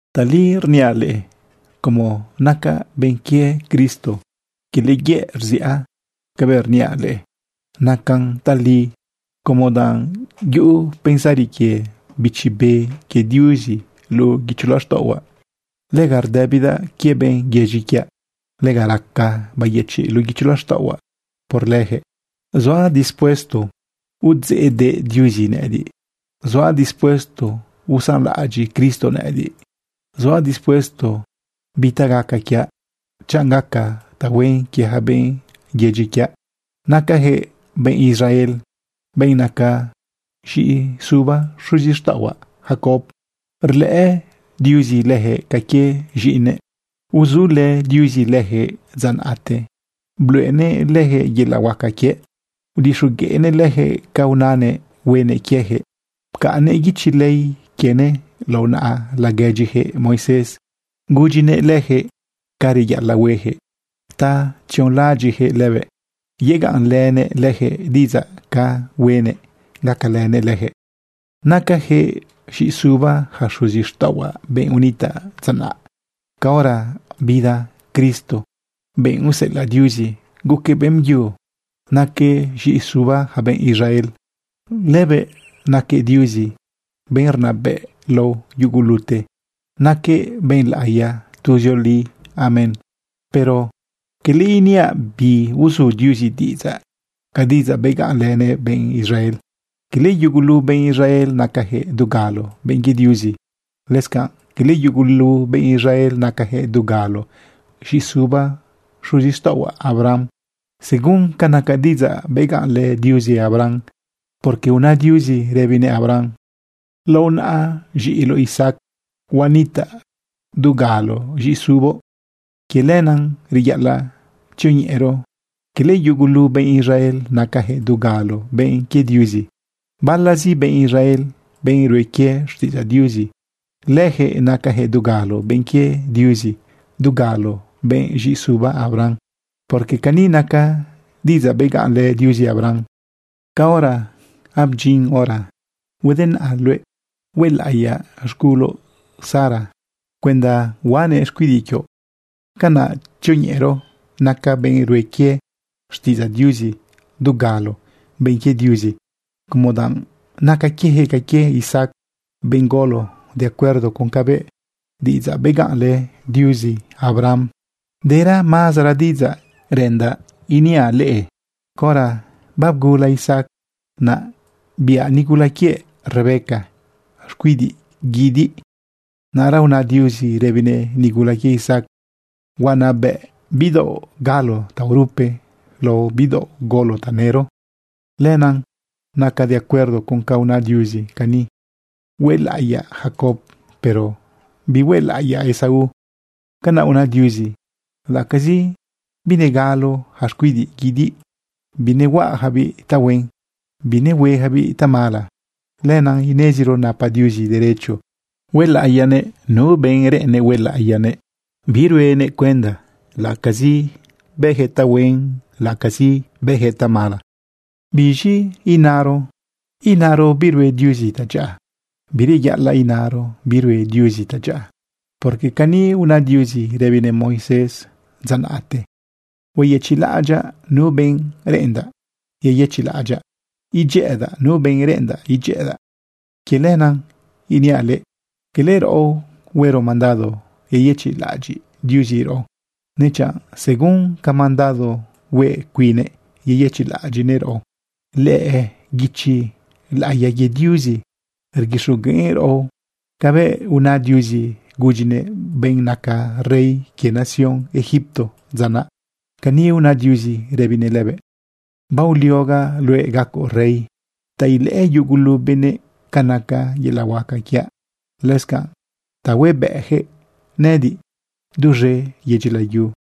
Tali rniaꞌ leꞌe, como nacaꞌ benꞌ quie Cristo, quele yëꞌ rziꞌa. Cabëꞌ rniaꞌ leꞌe nacan tali, como danꞌ yuꞌu pensari quie Bichi Be quie Diuzi luꞌu guicho laxtaꞌohuaꞌ. Lega rdëbidaꞌ quie benꞌ yedyi quiaꞌ. Lega raca bayëchiꞌ luꞌu guicho laxtaꞌohuaꞌ por lëjëꞌ. Zuaꞌ dispuesto udzeꞌdeꞌ Diuzi nëꞌëdiꞌ, zuaꞌ dispuesto usanlaꞌadyiꞌ Cristo nëꞌëdiꞌ, zuaꞌ dispuesto bi ta gaca quiaꞌ, chanꞌ gaca tahuen quie yaca benꞌ yedyi quiaꞌ. Nacajëꞌ benꞌ Israel, benꞌ naca z̃iꞌisuba xuzixtaꞌohuaꞌ Jacob. Rlëꞌë Diuzi leyaquëꞌ ca quie z̃iꞌinëꞌ. Uzulë Diuzi leyaquëꞌ dza naꞌte, bluꞌenëꞌ leyaquëꞌ yelaꞌ huaca quiëꞌ. Udixogueꞌnëꞌ leyaquëꞌ ca unanëꞌ huenëꞌ quiejëꞌ. Pcaꞌnnëꞌ guichi ley quienëꞌ lao naꞌa laguedyijëꞌ Moisés. Gudyinëꞌ lëjëꞌ ca reyaꞌalaꞌ huejëꞌ ta tzionlaꞌadyiꞌjëꞌ lëbëꞌ. Yegaꞌnlënëꞌ leyaquëꞌ diꞌidzaꞌ ca huenëꞌ gacalënëꞌ leyaquëꞌ. Nacajëꞌ z̃iꞌisuba yaca xuzixtaꞌohuaꞌ, benꞌ unitaꞌ dza naꞌ. Caora bida Cristo, benꞌ useꞌelaꞌ Diuzi, guquëꞌ beꞌmbyu naquëꞌ z̃iꞌisuba yaca benꞌ Israel. Lëbëꞌ naquëꞌ Diuzi, benꞌ rnabëꞌ lao yugulute. Naquëꞌ benꞌ laꞌiya tuzioli. Amén. Pero quele iniaꞌ biuzu Diuzi diꞌidzaꞌ ca diꞌidzaꞌ begaꞌnlënëꞌ benꞌ Israel. Cala yugulu benꞌ Israel nacajëꞌ dugalo benꞌ quie Diuzi. Lëscanꞌ cala yugulu benꞌ Israel nacayaquëꞌ dugalo z̃iꞌisuba xuzixtaꞌohuaꞌ Abraham según ca naca diꞌidzaꞌ begaꞌnlë Diuzi Abraham, porque una Diuzi rëbinëꞌ Abraham: “Lao naꞌa z̃iꞌiloꞌ Isaac huanitaꞌ dugalo z̃iꞌisuboꞌ.” Quie lenaꞌ reyaꞌalaꞌ tzioñeꞌero cala yugulu benꞌ Israel nacayaquëꞌ dugalo benꞌ quie Diuzi. Balazi benꞌ Israel, benꞌ rue quie xtiꞌidzaꞌ Diuzi, leyaquëꞌ nacayaquëꞌ dugalo benꞌ quie Diuzi, dugalo benꞌ z̃iꞌisuba Abraham. Porque cani naca diꞌidzaꞌ begaꞌnlë Diuzi Abraham: “Caora babedyin hora, huedenaꞌa luëꞌ huelaꞌiyaꞌ z̃guloꞌ Sara cuenda huaꞌanëꞌ xcuidiꞌ quioꞌ.” Canaꞌ tzioñeꞌero naca benꞌ rue quie xtiꞌidzaꞌ Diuzi dugalo benꞌ quie Diuzi como danꞌ naca quieyaquëꞌ ca quie Isaac, benꞌ golo de acuerdo con cabëꞌ diꞌidzaꞌ begaꞌnlë Diuzi Abraham. Dera mazara diꞌidzaꞌ reꞌendaꞌ iniaꞌ leꞌe. Caora babgula Isaac, naꞌ biꞌa nigula quiëꞌ Rebeca xcuidiꞌ guidiꞌ. Naꞌra una Diuzi rëbinëꞌ nigula quië Isaac: “Huanabëꞌ bidaoꞌ galo taorupe lao bidaoꞌ golo tanëro.” Lenaꞌ naca de acuerdo con ca una Diuzi cani: “Huelaꞌiyaꞌ Jacob, pero bihuelaꞌiyaꞌ Esaú.” Canaꞌ una Diuzi laꞌacazi binegalo yaca xcuidiꞌ guidiꞌ, binehuejabiꞌ tahuen, binehuejabiꞌ tamala. Lenaꞌ ineziro napa Diuzi derecho huelaꞌiyanëꞌ nu benꞌ reꞌennëꞌ huelaꞌiyanëꞌ, biruenëꞌ cuenda laꞌacazi bëjëꞌ tahuen, laꞌacazi bëjëꞌ tamala. ¿Biz̃i inaro chiꞌ? ¿Inaro birue Diuzi tadyaꞌa? ¡Bireyaꞌalaꞌ inaro birue Diuzi tadyaꞌa! Porque cani una Diuzi rëbinëꞌ Moisés dza naꞌte: “Hueyëchiꞌlaꞌadyaꞌ nu benꞌreꞌendaꞌ yeyëchiꞌlaꞌadyaꞌ. Idyëꞌëdaꞌ nu benꞌ reꞌendaꞌ idyëꞌëdaꞌ.” Quie lenaꞌ iniaꞌ leꞌe, cala raꞌo huero mandado yeyëchiꞌlaꞌadyiꞌ Diuzi raꞌo, nechanꞌ según ca mandado hue cuinnëꞌ yeyëchiꞌlaꞌadyiꞌnëꞌ raꞌo. Lëꞌë guichi laꞌiya quie Diuzi rguixogueꞌn raꞌo cabëꞌ una Diuzi gudyinëꞌ benꞌ naca rey quie nación Egipto dza naꞌ. Cani una Diuzi rëbinëꞌ lëbëꞌ: “Baoliogaꞌ luëꞌ gacoꞌ rey ta ilëꞌë yugulu benëꞌ ca naca yelaꞌ huaca quiaꞌ, lëscanꞌ ta huebëꞌjëꞌ nëꞌëdiꞌ duz̃e yedyi layu.”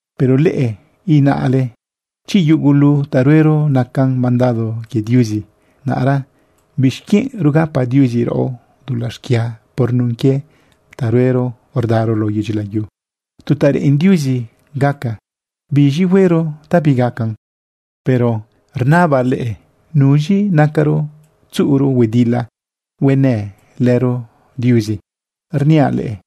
Pero leꞌe inale: “Chi yugulu ta ruero nacan mandado quie Diuzi, naꞌra ¿bixquienꞌ rugapa Diuzi raꞌo dulaꞌ xquia por nun quie ta ruero rdaro lao yedyi layu? ¿Tu ta reꞌen Diuzi gaca, biz̃i huero ta bigacan?” Pero rnabaꞌ leꞌe, ¿nuz̃i nacaro tzuꞌuro huedila huenë lëro Diuzi? Rniaꞌ leꞌe,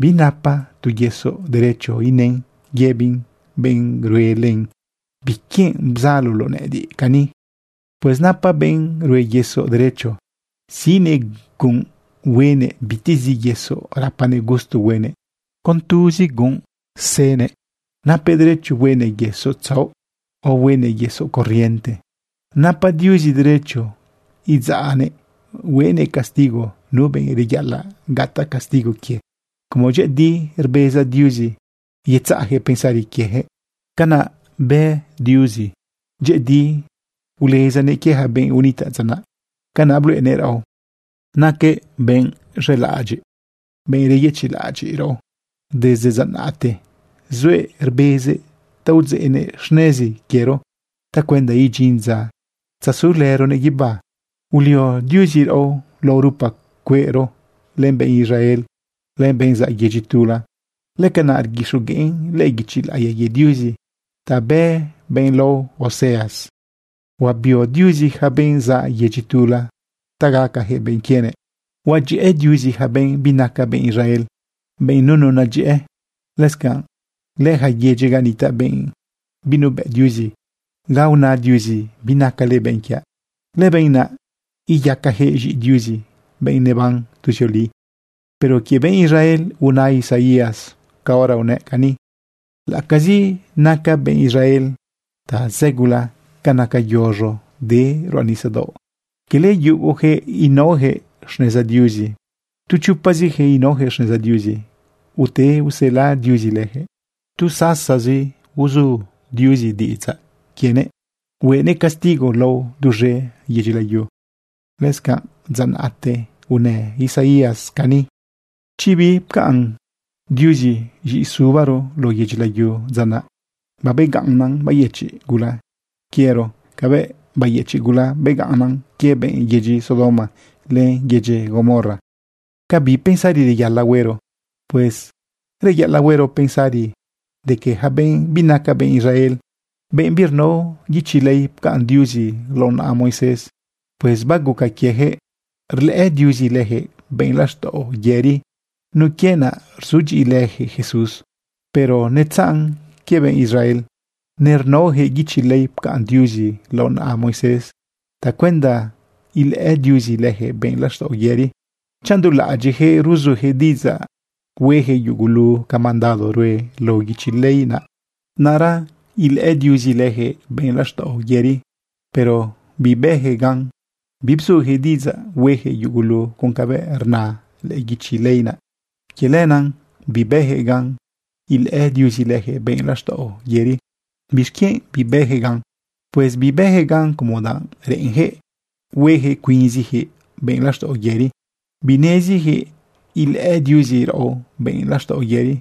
binapa tu yesoꞌ derecho inën yëbin benꞌ rue len: “¿Biquienꞌ bzaloloꞌ nëꞌëdiꞌ cani?” Pues napa benꞌ rue yesoꞌ derecho siꞌnëꞌ gunꞌ, huenëꞌ bitezi yesoꞌ rapanëꞌ gusto huenëꞌ. Con tuzi gunꞌ senëꞌ napëꞌ derecho huenëꞌ yesoꞌ tzaoꞌ, o huenëꞌ yesoꞌ corriente. Napa Diuzi derecho idzaꞌnëꞌ huenëꞌ castigo nu benꞌ reyaꞌalaꞌ gataꞌ castigo quie como dyëꞌëdi rbeza Diuzi yetzaꞌjëꞌ pensari quiejëꞌ. Canaꞌ bë Diuzi, dyëꞌëdi ulezanëꞌ quie yaca benꞌ unitaꞌ dza naꞌ. Canaꞌ bluꞌenëꞌ raꞌo naquëꞌ benꞌ z̃elaꞌadyiꞌ, benꞌ reyëchiꞌlaꞌadyiꞌ raꞌo. Desde dza naꞌte zuëꞌ rbezëꞌ ta udzeꞌnëꞌ xnezi quiero tacuenda idyin dza tzasulëronëꞌ guibá. Ulio Diuzi raꞌo lao rupa cueꞌro len benꞌ Israel len benꞌ zaꞌ yedyi tula. Lëcanaꞌ rguixogueꞌn lëꞌë guichi laꞌiya quie Diuzi ta bë benꞌ lao Oseas: Huabio Diuzi yaca benꞌ zaꞌ yedyi tula ta gacajëꞌ benꞌ quienëꞌ. Huadyëꞌë Diuzi yaca benꞌ binaca benꞌ Israel, benꞌ nunu nadyëꞌë. Lëscanꞌ lëyaca yedyi ga nitaꞌ benꞌ binuebëꞌ Diuzi, ga una Diuzi: “Binacale benꞌ quiaꞌ.” Lëbenꞌ naꞌ iyacajëꞌ z̃iꞌi Diuzi, benꞌ neban tuzioli. Pero quie benꞌ Israel una Isaías caora unëꞌ cani: “Laꞌacazi naca benꞌ Israel tazëgula ca naca yoz̃o de ruꞌa nisadaoꞌ, quele yugojëꞌ inaojëꞌ xneza Diuzi, tu chopazijëꞌ inaojëꞌ xneza Diuzi ute usela Diuzi lëjëꞌ. Tu sasazi uzu Diuzi diꞌidzaꞌ quienëꞌ huenëꞌ castigo lao duz̃e yedyi layu.” Lëscanꞌ dza naꞌte unë Isaías cani: Chi bipcaꞌn Diuzi z̃iꞌisubaro lao yedyi layu dza naꞌ, babegaꞌnnan bayëchiꞌ gula quiero cabëꞌ bayëchiꞌ gula begaꞌnnan quie benꞌ yedyi Sodoma len benꞌ yedyi Gomorra. ¿Ca bi pensari reyaꞌalaꞌ huero? Pues reyaꞌalaꞌ huero pensari de que yaca benꞌ binaca benꞌ Israel, benꞌ birnao guichi ley pcaꞌn Diuzi lao naꞌa Moisés, pues baguca quiejëꞌ rlëꞌë Diuzi lëjëꞌ benꞌ laxtaꞌo yëri nun quie naꞌ rzudyiꞌilëjëꞌ Jesús. Pero netzaꞌn quie benꞌ Israel. Nernaojëꞌ guichi ley pcaꞌn Diuzi lao naꞌa Moisés tacuenda ilëꞌë Diuzi leyaquëꞌ benꞌ laxtaꞌo yëri. Chanꞌ dulaꞌadyiꞌyaquëꞌ ruzujëꞌ diꞌidzaꞌ huejëꞌ yugulu ca mandado rue lao guichi ley naꞌ, naꞌra ilëꞌë Diuzi leyaquëꞌ benꞌ laxtaꞌo yëri. Pero bibëyaquëꞌ gan, bibzujëꞌ diꞌidzaꞌ huejëꞌ yugulu con cabëꞌ rna lëꞌë quichi ley naꞌ. Quie lenaꞌ bibëjëꞌ gan ilëꞌë Diuzi lëjëꞌ benꞌ laxtaꞌo yëri. ¿Bixquienꞌ bibëjëꞌ gan? Pues bibëjëꞌ gan como danꞌ reꞌenjëꞌ huejëꞌ cuinzijëꞌ benꞌ laxtaꞌo yëri. Binezijëꞌ ilëꞌë Diuzi raꞌo benꞌ laxtaꞌo yëri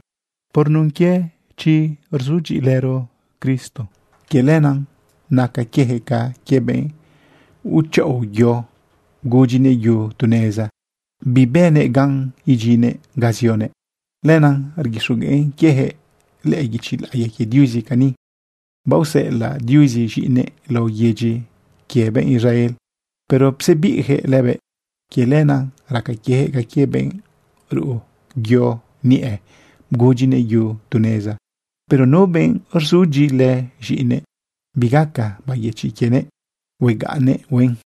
por nun quie chi rzudyiꞌilëro Cristo. Quie lenaꞌ naca quiejëꞌ ca quie benꞌ uchaꞌo yo, bgudyinëꞌ yu tu neza, bibënëꞌ gan idyinnëꞌ ga zionëꞌ. Lenaꞌ rguixogueꞌn quieyaquëꞌ lëꞌë guichi laꞌiya quie Diuzi cani: Baoseꞌelaꞌ Diuzi z̃iꞌinëꞌ lao yedyi quie benꞌ Israel, pero psebiꞌjëꞌ lëbëꞌ. Quie lenaꞌ raca quieyaquëꞌ ca quie benꞌ ruꞌu yo niꞌe, bgudyinëꞌ yu tu neza. Pero nu benꞌ rzudyiꞌilë z̃iꞌinëꞌ, bigaca bayëchiꞌ quienëꞌ, huegaꞌnnëꞌ huen.